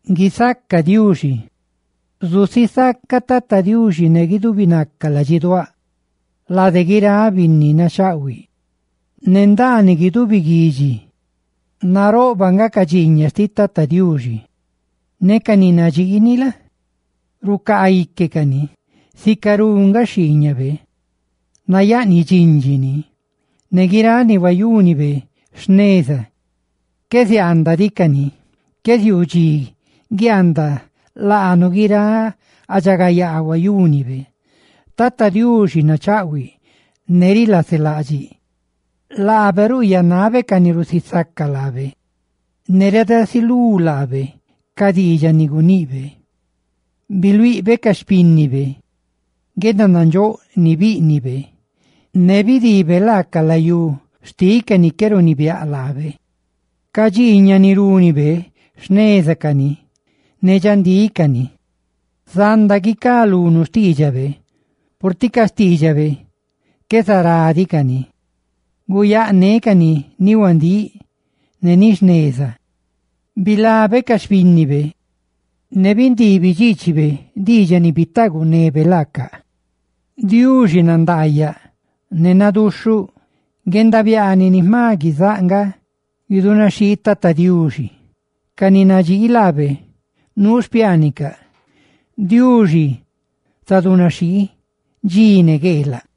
¡Guisaca Diuxi! Zusisacaꞌ Tata Diuxi ne guidubi naca ladxiduáꞌ lade guiráꞌ binni nachaꞌhuiꞌ, ne ndaaniꞌ guidubi guidxi. Naroꞌbaꞌ nga ca dxiiñaꞌ xtiꞌ Tata Diuxi, ne ca ni nadxiini la? rucaa ique cani. Sicarú nga xhiiñabe nayaꞌniꞌ dxindxi ni, ne guiráꞌ ni huayúnibe jneza, qué ziaandaꞌ diꞌ cani. Qué ziuu dxi guiaandaꞌ laanu guiráꞌ guendaridxagayaa huayúnibe. Tata Diuxi nachaꞌhuiꞌ ne rilaselaꞌdxiꞌ; laabe ruyaanabe ca ni rusisaca laabe; ¡ne reedasilú laabe ca diidxaꞌ ni guniꞌbe! Biluiꞌbe ca xpínnibe guendanandxóꞌ ni bíꞌnibe, ne bidiibe laaca ca layú xtiꞌ ca binni ni qué runibiáꞌ laabe. Ca dxiiñaꞌ ni rúnibe, jneza cani, ne dxandíꞌ cani; zanda guicá lunu xtiidxabe, purtiꞌ ca xtiidxabe qué zará diꞌ cani, ne guyáꞌ nécani, ni huandíꞌ ne ni jneza. Bilabe ca xpínnibe, ne bindiibi dxiichibe diidxaꞌ ni bitaagunebe laacaꞌ. Diuxi nandaayaꞌ ne naduxhuꞌ. Guendabiaaniꞌ ni jma guizáꞌ nga guidunaxhii Tata Diuxi; ca ni nadxii laabe nuu xpiaanicaꞌ. ¡Diuxi zadunaxhii dxi ne gueelaꞌ!